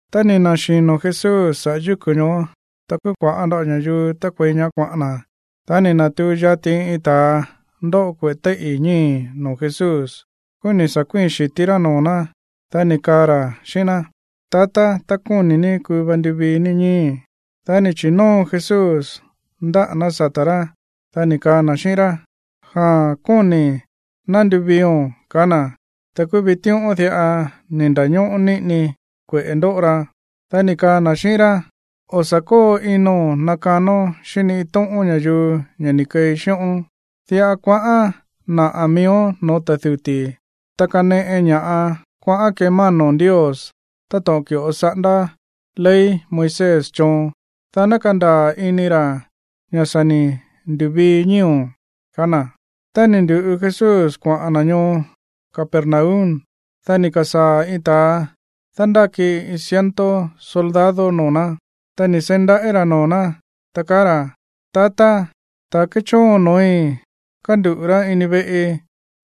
Tá ni̱ na̱xino̱ Jesús saꞌa̱ yúku̱ ñoó, ta kúú kua̱ꞌá nda̱ꞌo ña̱yuu tákuei ñaá kuaꞌa̱n na̱. Dá ni̱ na̱tuu yati iin ta̱a ndóꞌo kueꞌe̱ téíꞌi̱ ñíi̱ noo̱ Jesús. Kúú ni̱ sa̱ kuíi̱n xi̱tí rá noo̱ ná, dá ni̱ kaa ra̱ xíꞌín ná: ―Tatá, tá kóni̱ ní, kuu va nduvií ní ñíi̱í. Dá ni̱ chi̱nóo Jesús ndáꞌa̱ ná sata̱ rá, dá ni̱ kaa na̱ xíꞌín rá: ―Jaa̱n, kóni̱i̱. Ná nduviio̱n ―kaá na̱. Ta kúú vitíꞌón diꞌa ni̱ nda̱ñóꞌó niꞌini kueꞌe̱ ndóꞌo ra. Dá ni̱ kaa na̱ xíꞌín rá: ―O̱ sa̱ kóo ino̱n nakanón xíꞌín ni iin tóꞌón ña̱yuu ña̱ ni̱ keei xíꞌón. Diꞌa kuaꞌán naꞌa̱ miíón no̱ó ta̱ duti̱, ta kaneꞌe ña̱ꞌa kuaꞌán kemáno̱n Ndios, táto̱ꞌon ki̱ꞌo saꞌándá ley Moisés choon, dá ná kandaa̱ ini ra̱ ña̱ sa̱ ni̱ ndu̱vií ñíi̱o̱n ―kaá na̱. Tá ni̱ ndu̱ꞌu Jesús kuaꞌa̱n na̱ ñoo Capernaum, dá ni̱ ka̱sáa̱ iin ta̱a dándáki iin ciento soldado noo̱ ná. Ta ni̱ seí ndaꞌí ra̱ noo̱ ná, ta kaá ra̱: ―Tatá, ta̱ kéchóon no̱ói̱ kánduꞌu̱ rá ini veꞌi,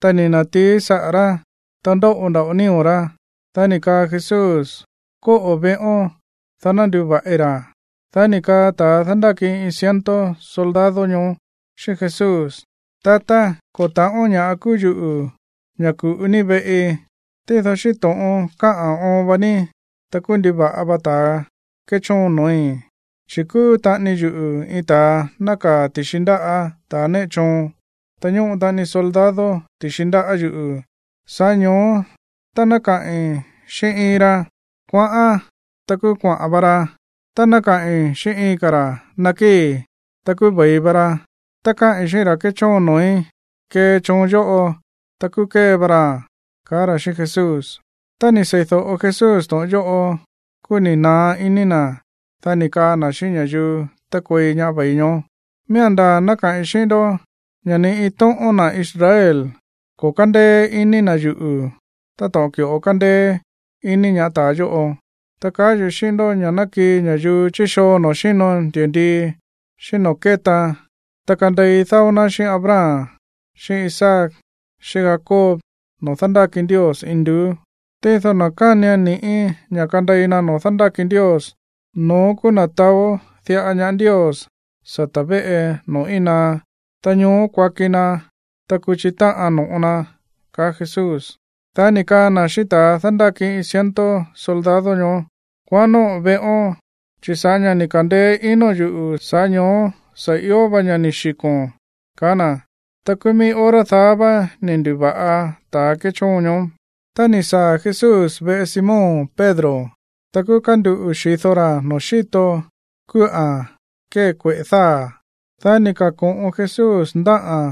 ta ni̱ na̱tií saꞌa̱ rá, ta ndóꞌo nda̱ꞌo nío̱ rá. Dá ni̱ kaa Jesús: ―Kóꞌo̱ veꞌón, dá ná nduva̱ꞌi ra̱. Dá ni̱ kaa ta̱a dándáki iin ciento soldado ñoó xíꞌín Jesús: ―Tatá, ko̱ ta̱ꞌón ña̱ꞌa kúú yuꞌu̱ ña̱ ku̱ꞌu ní veꞌi, tído xíꞌín to̱ꞌon kaꞌa̱n oon va ní, ta kúú nduva̱ꞌa va ta̱ kéchóon no̱ói̱. Chi̱ kúú taꞌani yuꞌu̱ iin ta̱a nákaa̱ ti̱xi ndáꞌa̱ ta̱ néꞌe choon. Ta ñóꞌo taꞌani soldado ti̱xi ndáꞌa̱ yuꞌu̱. Sa̱ꞌá ño̱ó tá ná kaꞌi̱n xíꞌín iin ra, “Kuaꞌán”, ta kúú kuaꞌa̱n va ra. Ta tá káꞌi̱n xíꞌín iin ka̱ ra̱, “Nakíi̱”, ta kúú ve̱i va ra. Tá káꞌi̱n xíꞌín ra̱ kéchóon noo̱í, “Kee choon yóꞌo”, ta kúú kée va raa̱n ―kaá ra̱ xíꞌín Jesús. Tá ni̱ seídóꞌo Jesús to̱ꞌon yóꞌo, kúú ni̱ naá iní na̱. Dá ni̱ kaa na̱ xíꞌín ña̱yuu tákuei ñaá ve̱i ñoó: ―Miía̱n ndaa̱ ná kaꞌi̱n xíꞌín ndó ña̱ ni iin tóꞌón na̱ Israel ko̱ kándéé iní na̱ yuꞌu̱ táto̱ꞌon ki̱ꞌo kándéé iní ñaá ta̱a yóꞌo. Ta kaá yuꞌu̱ xíꞌín ndó ña̱ ná kii ña̱yuu chí xoo noo̱ xíno ndi̱ndii, xíꞌín noo̱ kétaan, ta kandei dáó ná xíꞌín Abraham, xíꞌín Isaac, xíꞌín Jacob noo̱ dándáki Ndios induú. Tído na̱ kánian ni̱ꞌí ña̱ kandei na noo̱ dándáki Ndios, no̱ón kúú na̱ taó diꞌa ñaá Ndios sata̱ véꞌe noo̱ íin naá, ta ñoó kuaki na, ta kuchi táꞌan no̱ꞌo na. Dá ni̱ kaa na̱ xíꞌín ta̱a dándáki iin ciento soldado ñoó: ―Kuaꞌán nóꞌo̱n veꞌón, chi̱ sa̱ꞌá ña̱ ni̱ ka̱ndeé inóo̱n yuꞌu̱, sa̱ꞌá ño̱ó sa̱ io va ña̱ ni̱ xiko̱n ―kaá na̱. Ta kúú mií hora daá vá ni̱ ndu̱va̱ꞌa ta̱ kéchóon ñoó. Tá ni̱ saa̱ Jesús veꞌe Simón Pedro, ta kúú kánduꞌu̱ xi̱do ra̱ noo̱ xíto kúꞌa̱n kée kueꞌe̱ dáa̱. Dá ni̱ ka̱ko̱ꞌon Jesús ndáꞌa̱n,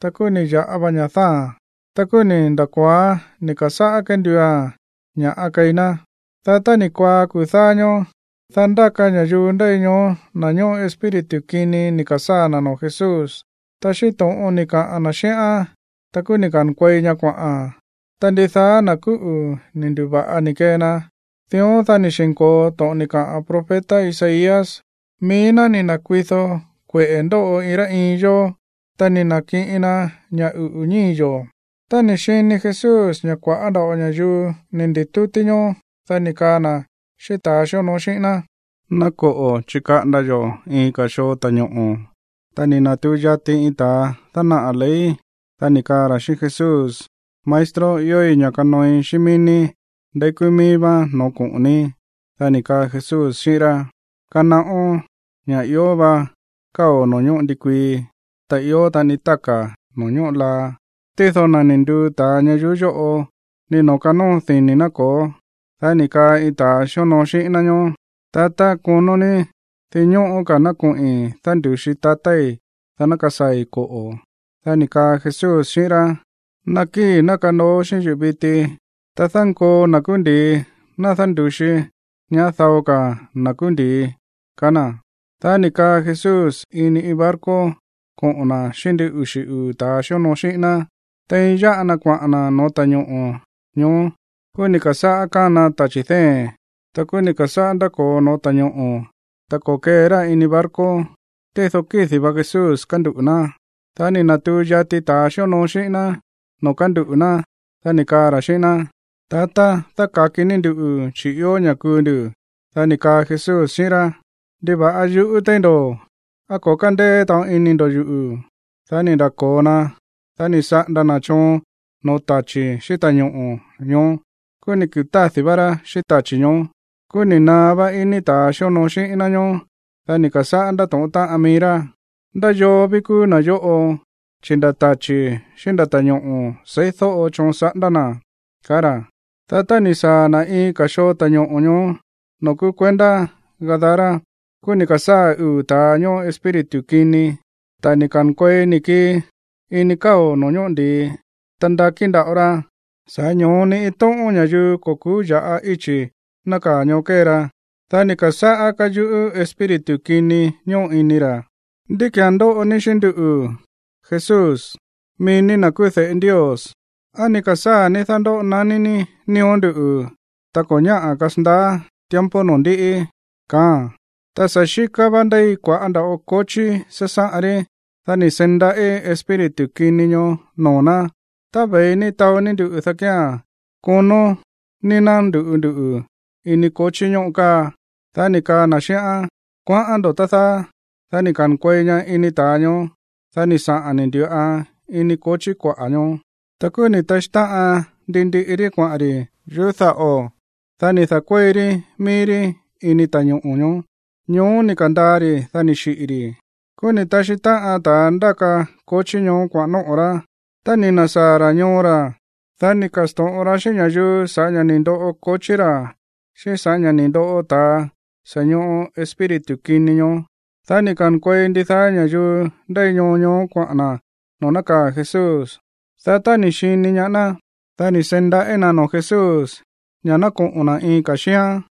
ta kúú ni̱ ya̱ꞌa va ña̱ dáa̱a̱n. Ta kúú ni̱ nda̱ko̱oán ni̱ ka̱sáꞌá kenduua̱n ña̱ꞌa keí ná. Dá tá ni̱ kuaá kuu̱ dáá ñóó, dá ndáka ña̱yuu ndéi ñoó na̱ ñóꞌo espíritu kini ni̱ ka̱sáa̱ na̱ noo̱ Jesús. Ta xíꞌín to̱ꞌon ni̱ kaꞌa̱n na̱ xíꞌán, ta kúú ni̱ ka̱nkuei ña kuaꞌa̱n. Ta ndidaá na̱ kúꞌu̱ ni̱ ndu̱va̱ꞌa ni̱ kee na. Dión, dá ni̱ xi̱nko̱o to̱ꞌon ni̱ kaꞌa̱n profeta Isaías: “Mií ná ni̱ na̱kuido kueꞌe̱ ndóꞌo iin rá iin yó, ta ni̱ na̱kiꞌin na ña̱ uꞌu̱ ñíi̱ yo̱.” Tá ni̱ xini Jesús ña̱ kua̱ꞌá nda̱ꞌo ña̱yuu ni̱ ndi̱tútí ñoó, dá ni̱ kaa na̱ xíꞌín ta̱a xíonoo xíꞌín ná: ―Ná koꞌo̱ chikaꞌanda yo̱ iin ka̱ xoo ta̱ñoꞌo̱. Ta ni̱ na̱tuu yati iin ta̱ dánaꞌa̱ ley, dá ni̱ kaa ra̱ xíꞌín Jesús: ―Maestro, iói̱ ña̱ kanooi xíꞌín mií ní ndeí kúú míí vá no̱ó koꞌo̱n ní. Dá ni̱ kaa Jesús xíꞌín rá: ―Kanaꞌón ña̱ ió va káo̱ noo̱ ñóꞌo ndikuii, ta ió taꞌani táka̱ noo̱ ñóꞌo laa. Tído na̱ ni̱ nduu ta̱a ñayuú yóꞌo, ni noo̱ kanóo dini̱ na̱ ko̱ó. Dá ni̱ kaa iin ta̱ xíonoo xíꞌín ná ñoó: ―Tatá, konó ní dinñóꞌó ka̱ ná koꞌi̱n dándu̱xi tatái̱, dá ná kasaa̱i̱, koꞌo̱. Dá ni̱ kaa Jesús xíꞌín rá: ―Nakíi̱, ná kanoo xíꞌín yuꞌu̱ viti, ta dánkoo na̱ kúú ndi̱i ná dándu̱xi ñaá dao ka̱ na̱ kúú ndi̱i ―kaá na̱. Dá ni̱ kaa Jesús ini iin barco koꞌo̱n na̱ xíꞌín ndin uxi̱ uu̱ ta̱a xíonoo xíꞌín ná. Tein yáꞌa na kuaꞌa̱n na̱ no̱ó ta̱ñoꞌo̱ ñoó, kúú ni̱ ka̱sáꞌá kána tachi̱ dée̱n. Ta kúú ni̱ ka̱sáꞌá ndáko̱o no̱ó ta̱ñoꞌo̱, ta ko̱kee rá ini barco. Tído kídi̱ va Jesús kánduꞌu̱ ná. Dá ni̱ na̱tuu yati ta̱a xíonoo xíꞌín ná noo̱ kánduꞌu̱ ná, dá ni̱ kaa ra̱ xíꞌín ná: ―¡Tatá, dáka̱ki ní nduꞌu̱, chi̱ ió ña̱ kuu ndu̱! Dá ni̱ kaa Jesús xíꞌín rá: ―¿Ndiva̱ꞌa yuꞌú téí ndo̱? ¿Á ko̱ kándéé taꞌon ini ndo̱ yuꞌu̱? Dá ni̱ nda̱ko̱o na. Dá ni̱ saꞌanda na̱ choon no̱ó tachi̱ xíꞌín ta̱ñoꞌo̱ ñoó. Kúú ni̱ kutádi̱ vá rá xíꞌín tachi̱ ñoó. Kúú ni̱ naá vá iní ta̱a xíonoo xíꞌín ná ñóó. Dá ni̱ ka̱sáꞌá ndátóꞌón táꞌan mií rá: ―¿Ndá yoo ví kúú na̱ yóꞌo, chi̱ nda̱ tachi̱ xíꞌín nda̱ ta̱ñoꞌo̱ seídóꞌo choon saꞌándá na̱? ―kaá ra̱. Dá tá ni̱ saa̱ na̱ iin ka̱ xoo ta̱ñoꞌo̱ ñoó noo̱ kúú kuendá Gadara, kúú ni̱ ka̱sáa̱ uu̱ ta̱a ñóꞌo espíritu kini, ta̱ ni̱ ka̱nkuei ni̱ kii ini káo̱ noo̱ ñóꞌo ndi̱i. Ta ndakí nda̱ꞌo ra, sa̱ꞌá ño̱ó ni iin tóꞌón ña̱yuu ko̱ ku̱ú ya̱ꞌa íchi̱ nákaa̱ ñoó kée ra. Dá ni̱ ka̱sáꞌá káyuꞌú espíritu kini ñóꞌo ini ra̱: ―¿Ndí ki̱án ndóꞌo ní xíꞌín nduꞌu̱, Jesús, mií ní na̱ kúú de̱ꞌe Ndios? ¿Á ni̱ ka̱sáa̱ ní dándóꞌo naní ní nío̱ nduꞌu̱ tá ko̱ ñáꞌa̱ kasandaá tiempo noo̱ ndiꞌi? ―kaáa̱n. Ta sa̱ xíká vá ndéi kua̱ꞌá nda̱ꞌo kochí sásáꞌan rí. Dá ni̱ seí ndaꞌí espíritu kini ñoó noo̱ ná: ―Tá ve̱i ní taó ní nduꞌu̱, dá kía̱n konó ní ná ndu̱ꞌu nduꞌu̱ ini kochí ñóꞌo káa. Dá ni̱ kaa na̱ xíꞌán: ―Kuaꞌán ndo̱, tá dáá. Dá ni̱ ka̱nkuei ña ini ta̱a ñoó. Dá ni̱ saꞌa̱n ni̱ ndu̱ꞌan ini kochí kuaꞌa̱ ñoó. Ta kúú ni̱ taxí táꞌan ndi ndiꞌi rí kuaꞌa̱n ri̱ yuꞌú daꞌo̱, dá ni̱ da̱kuéi rí mií rí ini ta̱ñoꞌo̱ ñoó. Ñoó ni̱ ka̱ndaa ri̱, dá ni̱ xiꞌi̱ ri̱. Kúú ni̱ taxí táꞌan ta̱ ndáka kochí ñoó kuaꞌa̱n nóꞌo̱ rá. Tá ni̱ na̱sáa̱ ra̱ ñoo ra̱, dá ni̱ ka̱sto̱ꞌon ra xíꞌín ña̱yuu sa̱ꞌá ña̱ ni̱ ndoꞌo kochí ra̱ xíꞌín sa̱ꞌá ña̱ ni̱ ndoꞌo ta̱a sa̱ ñoꞌo espíritu kini ñoó. Dá ni̱ ka̱nkuei ndidaá ña̱yuu ndéi ñoo ñoó kuaꞌa̱n na̱ noo̱ nákaa̱ Jesús. Dá tá ni̱ xini ñaá ná, dá ni̱ seí ndaꞌí na̱ noo̱ Jesús ña̱ ná koꞌo̱n na̱ iin ka̱ xíán.